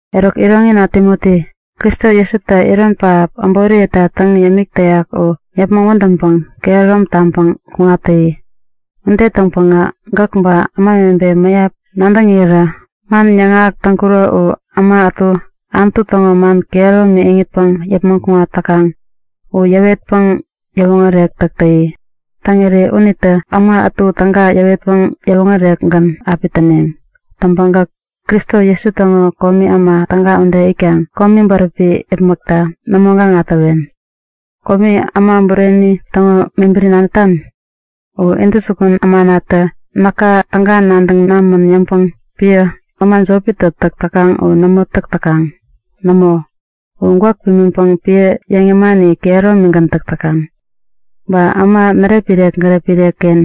Eruk iroŋina Timoti, Kristo Jesutä iron pähap äboriyeta täŋ yämik täyak u yäpmäŋ wädäŋpäŋ kehärom taŋpäŋ kuŋat täyi. Ude täŋpäŋä gäk ba ämawebe mäyap nadäŋirä man yäŋahäk täŋkuro u äma ätu Anutu täŋo man kehäromi iŋitpäŋ yäpmäŋ kuŋat täkaŋ u yäwetpäŋ yäwoŋärek täk täyi. Täŋiri unitä äma ätu täga yäwetpäŋ yäwoŋärekgän api täneŋ. Täŋpäŋ gäk Kristo Jesu täŋo komi äma täga ude itkaŋ komi bäräpi yäpmäkta nämo gaŋa täwen. Komi äma bureni täŋo mebäri nadätan? U intäjukun ämanatä näka täga nadäŋ namän yäŋpäŋ piä, äma jopitä täk täkaŋ u nämo täk täkaŋ. Nämo, u gwäk pimiŋpäŋ piä yäŋ yämani kehäromigän täk täkaŋ. Ba äma närepmirek-gärepmirek-ken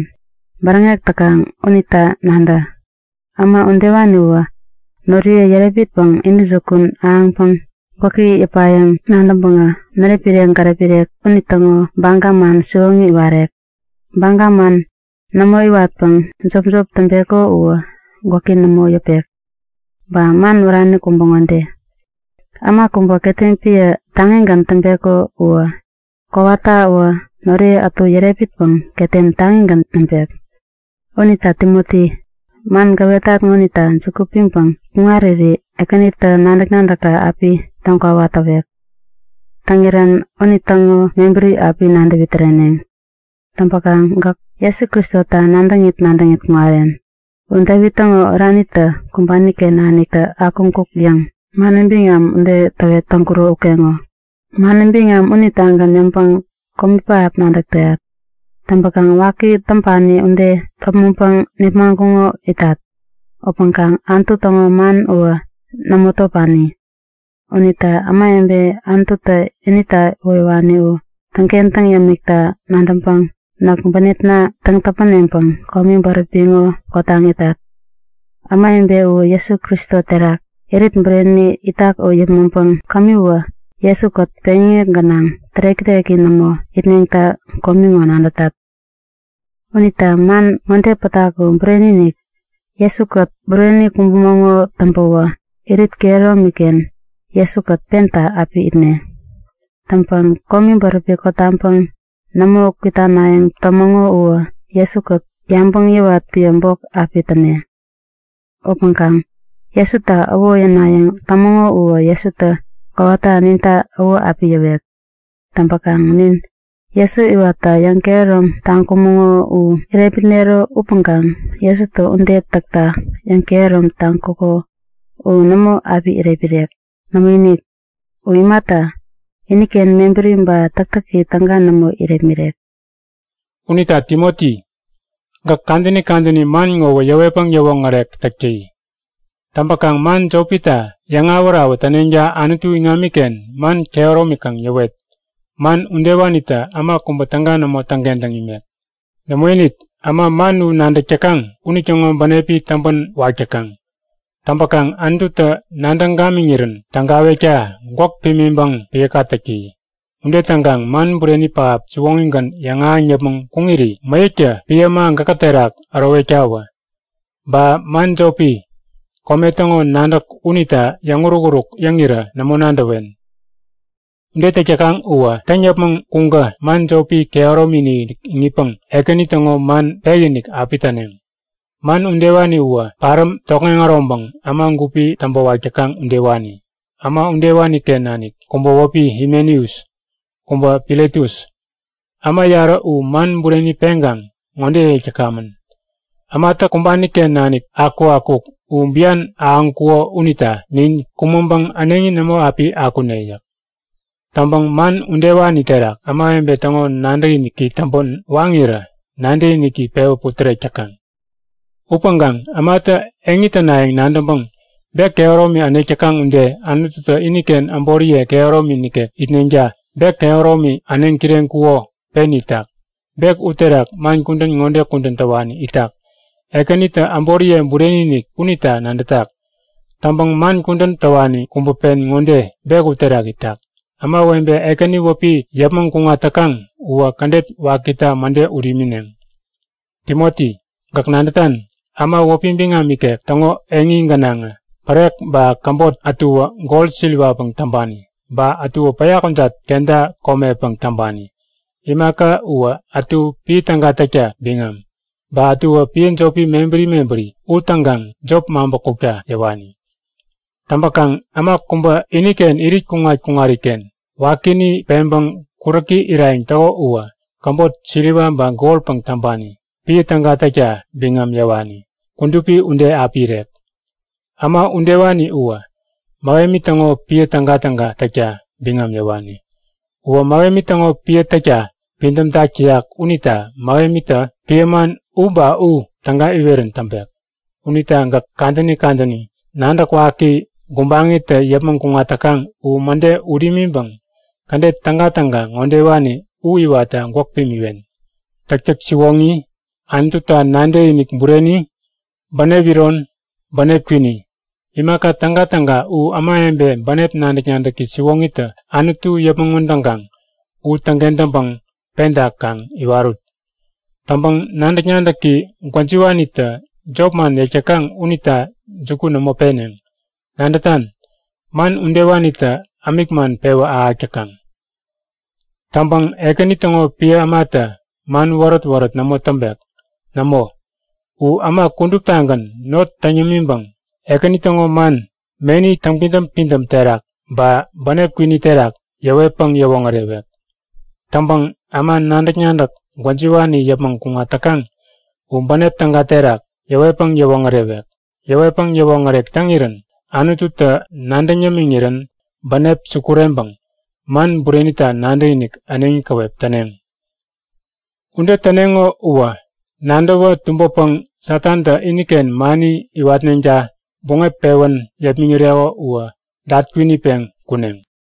bäräŋek täkaŋ unita nadä. Äma udewaniwä noriye yärepmitpäŋ intäjukun ahäŋpäŋ gwäki yäpayäŋ nadäŋpäŋä, närepmirek-gärepmirek unitäŋo baga man siwoŋi iwarek. Baga man nämo iwatpäŋ jopjop täŋpeko uwä gwäki nämo yäpek. Ba man wärani kubä ŋode; Äma kubä ketem piä taŋigän täŋpeko uwä kowatawä noriye ätu yärepmitpäŋ ketem taŋigän näŋpek. Unita Timoti, man gäwetat ŋonita juku piŋpäŋ kuŋariri Ekänitä nadäk-nadäkka api täŋkwawa täwek. Täŋirän unitäŋo mebäri api nadäwi-täreneŋ. Täŋpäkaŋ gäk Jesu Kristota nadäŋit nadäŋit kuŋaren. U Devit täŋo oranitä kumbani-ken naniktä akuŋkuk yäŋ mani biŋam ude täwet täŋkuro ukeŋo. Mani biŋam unitagän yäŋpäŋ komi pähap nadäk täyat. Täŋpäkaŋ waki täŋpani ude topmäŋpäŋ nepmaŋkuŋo itat. Upäŋkaŋ Anutu täŋo man uwä nämo topani! Unita ämawebe Anututä inita iwoyäwani u täŋkentäŋ yämikta nadäŋpäŋ näk bänepna täŋ-täpäneŋpäŋ komi bäräpi ŋo kotaŋ itat. Ämawebe uwä Jesu Kristo terak irit bureni itak u yäpmäŋpäŋ kämiwä Jesu-kät peŋyäŋek gänaŋ tärek-täreki nämo itneŋta komi ŋo nadätat. Unita man ŋode pätak u bureni-inik; Jesu-kät bureni kumbumäŋo täŋpäwä irit kehäromi-ken Jesu-kät penta api itne. Täŋpäŋ komi bäräpi kotaŋpäŋ nämo kwitanayäŋ tämäŋo uwä Jesu-kät yabäŋ yäwat piä bok api täne. Upäŋkaŋ Jesuta äwo yänayäŋ tämäŋo uwä Jesutä kowata ninta äwo api yäwek. Täŋpäkaŋ nin Jesu iwatta yäŋkehärom taŋkumäŋo u irepmitnero upäŋkaŋ Jesutä ude täkta yäŋkehärom taŋkuko u nämo api irepmirek. Nämoinik! U imata, iniken mebäri ba täktäki täga nämo irepmirek. Unita Timoti, gäk kadäni kadäni man ŋowä yäwetpäŋ yäwoŋärek täk täyi. Täŋpäkaŋ man jopita yäŋawät-awät täneŋta Anutu iŋamiken man kehäromi kaŋ yäwet. Man udewanitä äma kubä täga nämo täŋkentäŋ imek. Nämoinik, äma man u nadäk täkaŋ unitäŋo bänepi täŋpänwak täkaŋ. Täŋpäkaŋ Anututä nadäŋ gamiŋirän tägawekta gwäk pimiŋpäŋ piäka täk täyi. Ude täŋkaŋ man bureni pähap siwoŋigän yäŋahäŋ yäpmäŋ kuŋiri mäyäktä piä äma gäkä terak ärowektawä. Ba man jopi, kome täŋo nadäk unita yäŋuruk-uruk yäŋirä nämo nadäwen. Ude täk täkaŋ uwä täŋ yäpmäŋ kuŋkä man jopi kehäromi-inik iŋitpäŋ Ekäni täŋo man pekinik api täneŋ. Man udewani uwä paräm tokŋeŋ äroŋpäŋ äma gupi täŋpäwak täkaŋ udewani. Äma udewani-ken nanik kubä wäpi Himeneus, kubä Filetus. Äma yarä u man bureni peŋkaŋ ŋode yäk täkamän; Ämatä kumbani-ken nanik akukakuk u bian ahäŋkuko unita nin kumäŋpäŋ äneŋi nämo api akune yäk. Täŋpäŋ man udewani terak ämawebe täŋo nadäkiniki täŋpän waŋirä nadäkiniki pewä putärek täkaŋ. Upäŋkaŋ ämatä eŋi tänayäŋ nadäŋpäŋ bek kehäromi änek täkaŋ ude Anututä iniken äboriye kehäromi nikek itneŋta bek kehäromi äneŋ-kireŋkuko pen itak. Bek uterak man kudän ŋode kudän täwani itak; Ekänitä äboriye bureni-inik unita nadätak. Täŋpäŋ man kudän täwani kubä pen ŋode bek uterak itak; Ämawebe Ekäni wäpi yäpmäŋ kuŋat täkaŋ uwä kädet wakita mäde ut imineŋ. Timoti, gäk nadätan? Äma wäpi biŋam ikek täŋo eŋi gänaŋä pärek ba käbot ätuwä gol siriwapäŋ täŋpani. Ba ätuwä päya kujat kenta komepäŋ täŋpani. Imaka uwä ätu piä täga täkta biŋam ba ätuwä piä jopi mebäri mebäri u täŋkaŋ jop maŋpä kukta yäwani. Täŋpäkaŋ äma kubä iniken irit kuŋat-kuŋariken wakini peŋpäŋ kuräki irayäŋ täko uwä käbot siliwa ba golpäŋ täŋpani, piä täga täkta biŋam yäwani, kudupi ude api irek. Äma udewani uwä Mähemi täŋo piä tägatäga täkta biŋam yäwani. Uwä Mähemi täŋo piä täkta pidämtak täyak unita Mähemitä piä man u ba u täga iwerän täŋpek. Unita gäk kadäni kadäni nadäk waki gubaŋitä yäpmäŋ kuŋat täkaŋ u mäde ut imiŋpäŋ kädet tägatäga ŋodewani u iwatta gwäk pimiwen; Täktäk siwoŋi, Anututa nadäkinik bureni, bänep iron, bänep kwini. Imaka tägatäga u ämawebe bänep nadäk-nadäki siwoŋitä Anutu yäpmäŋ wädäk täkaŋ u täŋkentäŋpäŋ penta kaŋ iwarut. Täŋpäŋ nadäk-nadäki gwäjiwanitä jopman yäk täkaŋ unita juku nämo peneŋ. Nadätan, man udewanitä ämik man pewä ahäk täkaŋ. Täŋpäŋ Ekäni täŋo piä ämatä man wärät-wärät nämo täŋpek. Nämo, u äma kuduptagän not täŋ yämiŋpäŋ Ekäni täŋo man meni täŋpidäm-pidäm terak ba bänep kwini terak yäwetpäŋ yäwoŋärewek. Täŋpäŋ äma nadäk-nadäk gwäjiwani yäpmäŋ kuŋat täkaŋ u bänep täga terak yäwetpäŋ yäwoŋärewek. Yäwetpäŋ yäwoŋärek täŋirän Anututä nadäŋ yämiŋirän bänep sukureŋpäŋ man burenita nadäkinik äneŋi käwep täneŋ. Ude täneŋo uwä nadäwä tumbäpäŋ Satantä iniken mani iwatneŋta buŋep pewän yepmäŋireko u dat-kwinitpeŋ kuneŋ.